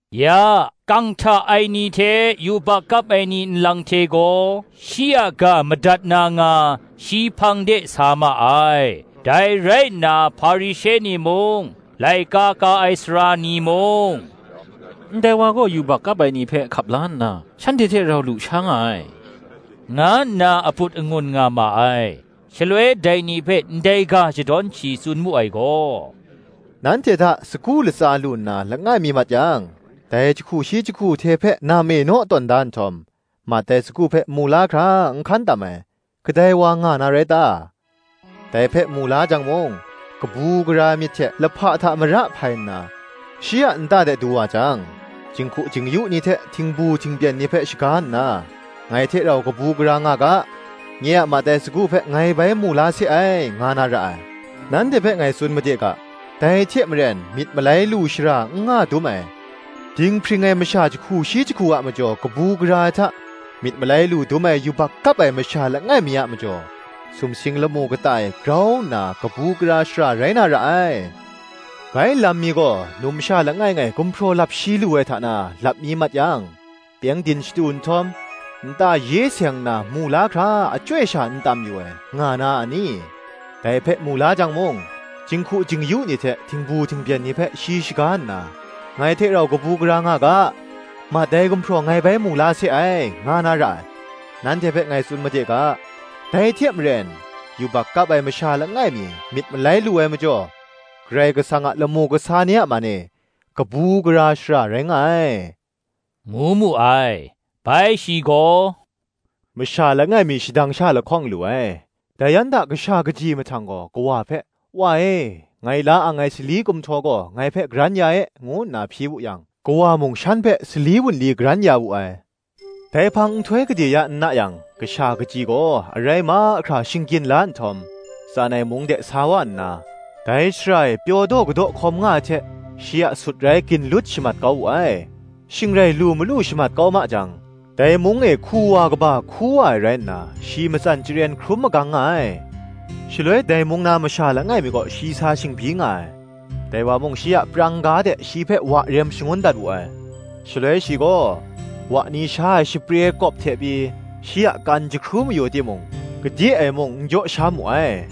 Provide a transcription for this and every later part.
Ya, kang hta ai ni hte yubak kap ai ni nlang hte gaw, shi a ga madat na nga, shi hpang de sa ma ai. Dai rai nna Hparishe ni mung, laika ka ai sara ni mung, “Ndai wa gaw yubak kap ai ni hpe hkap la nna, shanhte hte rau lu sha nga ai,” nga nna aput angun nga ma ai. Shaloi dai ni hpe ndai ga shadawn shi tsun mu ai gaw, “Nanhte hta, sagu latsa lu nna langai mi mat yang, dai jahku shi jahku hte hpe nam e naw tawn da nhtawm, mat ai sagu hpe mu la hkra n hkan tam ai, kadai wa nga na rai ta? Dai hpe mu la jang mung, kabu gara ai myit hte lahpa hta mara hpai nna, shi a nta de du wa jang, jinghku jing-yu ni hte htingbu htingbyen ni hpe shaga nna, ‘Ngai hte rau kabu gara nga ga: nye a mat ai sagu hpe ngai bai mu la se ai,’ nga na ra ai. Nanhte hpe ngai tsun made ga, ‘Dai hte maren, myit malai lu shara n nga dum ai, dinghpring ai masha jahku shi jahku a majaw kabu gara ai hta, myit malai lu dum ai yubak kap ai masha langai mi a majaw, sumsing lamu kata e grau nna kabu gara shara rai na ra ai. “Bai lam mi gaw, numsha langai ngai gumhpraw lap shi lu ai hta na, lap mi mat yang, pyengdin shatu nhtawm, nta ye seng nna mu la hkra achyoi sha n tam yu ai, nga na a ni? Dai hpe mu la jang mung, jinghku jing-yu ni hte htingbu htingbyen ni hpe shi shaga nna, Ngai hte rau kabu gara nga ga; mat ai gumhpraw ngai bai mu la se ai,” nga na ra ai. Nanhte hpe ngai tsun made ga, “Dai hte maren, yubak kap ai masha langai mi, myit malai lu ai majaw, Karai Kasang a lamu kasa ni a man e, kabu gara shara rai nga ai,” ngu mu ai. “Bai shi gaw, Masha langai mi shadang sha lahkawng lu ai. Dai yan hta kasha kaji mahtang gaw, kawa hpe, ‘Wa e, ngai la ang ai sali kumhtaw gaw, ngai hpe karan ya e,’ ngu nna hpyi wu yang, kawa mung shan hpe sali wunli karan ya wu ai. Dai hpang nhtoi gade ya n na yang, kasha kaji gaw arai mahkra shinggyin la nhtawm, tsan ai mung de sa wa nna, dai shara e pyaw daw kadaw hkawm nga ai hte, shi a sutrai ginlut shamat kau wu ai. Shing rai lu malu shamat kau ma jang, dai mung e hku wa kaba hku wa ai rai nna, shi matsan chyaren hkrum magang nga ai. Shaloi dai mung na masha langai mi kaw shi sa shingbyi nga ai: dai wa mung shi a prang ga de, shi hpe wa rem shangun dat wu ai. Shaloi shi gaw, wa ni sha ai shapre kawp hte pyi, shi a kan jahkru mayu timung, gade e mung n jaw sha mu ai.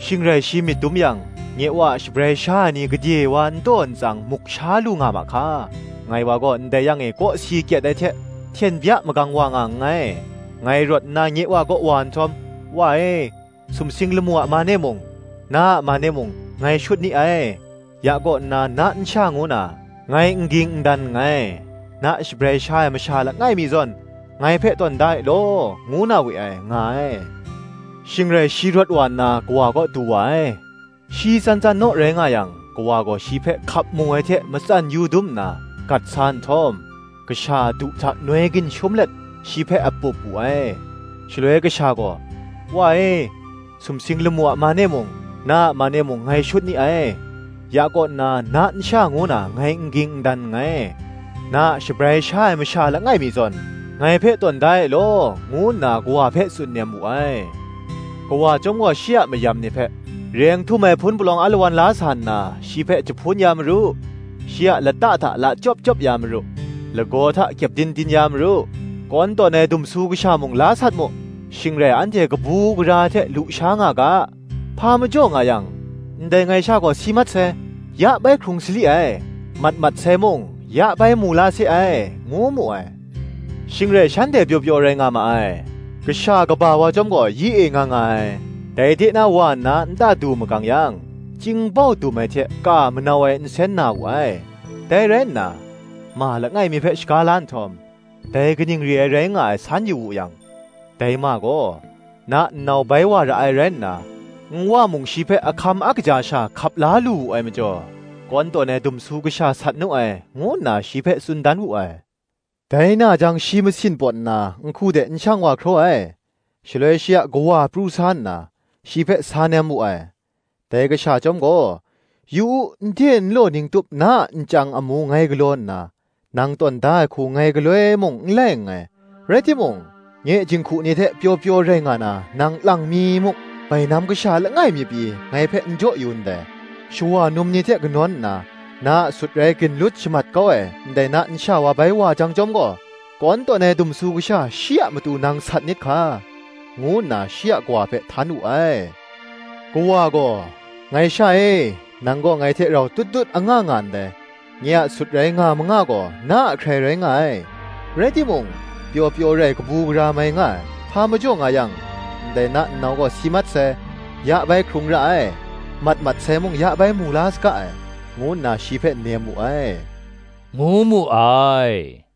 Shing rai shi myit dum yang, ‘Nye wa a shabrai sha ai ni gade wa n taw n tsang muk sha lu nga ma hka! ngai wa gaw ndai yang e kawsi kyet ai hte hten bya magang wa nga nngai: ngai rawt nna nye wa kaw wa nhtawm, Wa e, sumsing lamu a man e mung, na a man e mung, ngai shut ni ai: ya kaw nna na nsha ngu na, ngai n ging n dan nngai: na shabrai sha ai masha langai mi zawn ngai hpe tawn da e law, ngu na we ai,’ nga ai. Shing rai shi rawt wa nna, kawa kaw du wa ai. Shi tsan tsan naw rai nga yang, kawa gaw shi hpe hkap mu ai hte matsan yu dum nna, gat sa nhtawm, kasha a du hta noi ginshum let, shi hpe a pup wu ai. Shaloi kasha gaw, ‘Wa e, sumsing lamu a man e mung, na a man e mung, ngai shut ni ai: ya kaw nna na nsha ngu na ngai n ging n dan nngai: (na a shabrai sha ai masha langai mi zawn, ngai hpe tawn da e law)’ ngu nna kawa hpe tsun nem wu ai. Kawa chyawm gaw shi a mayam ni hpe, “Reng htum ai hpun palawng alawan la sa nna, shi hpe jahpun ya maru; shi a lata hta lachyawp chyawp ya maru; lagaw hta kyepdin din ya maru; kawn tawn ai dumsu kasha mung la sat mu: shing rai anhte kabu gara ai hte lu sha nga ga: hpa majaw nga yang, ndai ngai sha gaw si mat sai, ya bai hkrung sali ai; mat mat sai mung, ya bai mu la se ai,” ngu mu ai. Shing rai shanhte pyaw pyaw rai nga ma ai. Kasha kaba wa chyawm gaw yi e nga nga ai; dai de na wa nna nta du magang yang, chying bau dum ai hte ka manau ai nsen na wu ai; dai rai nna, ma langai mi hpe shaga la nhtawm, dai kaning re ai rai nga ai, san yu wu yang, dai ma gaw, “Na nnau bai wa ra ai rai nna, nwa mung shi hpe a hkam a kaja sha hkap la lu wu ai majaw, kawn tawn ai dumsu kasha sat nu ai,” ngu nna shi hpe tsun dan wu ai. Dai na jang shi masin pawt nna, nhku de n shang wa hkraw ai. Shaloi shi a kawa pru sa nna, shi hpe sa nem wu ai. Dai kasha chyawm gaw, “Yu u, nde nlaw ning tup na a nchyang amu ngai galaw nna, nang tawn da ai hku ngai galoi mung n lai nngai: rai timung, nye jinghku ni hte pyaw pyaw rai nga na, nang lang mi muk bainam kasha langai mi pyi, ngai hpe n jaw yu ndai: shawa num ni hte kanawn nna, na a sutrai ginlut shamat kau ai ndai na nsha wa bai wa jang chyawm gaw, kawn tawn ai dumsu kasha, shi a matu nang sat nit hka,” ngu nna shi a kawa hpe htan wu ai. Kawa gaw, “Ngai sha e, nang gaw ngai hte rau tut tut anga nga ndai; nye a sutrai nga manga gaw, na a hkrai rai nga ai. Rai timung, pyaw pyaw rai kabu gara mai nga ai; hpa majaw nga yang, ndai na nnau gaw si mat sai, ya bai hkrung ra ai: mat mat sai mung, ya bai mu la saga ai, ngu nna shi hpe nem wu ai,” ngu mu ai.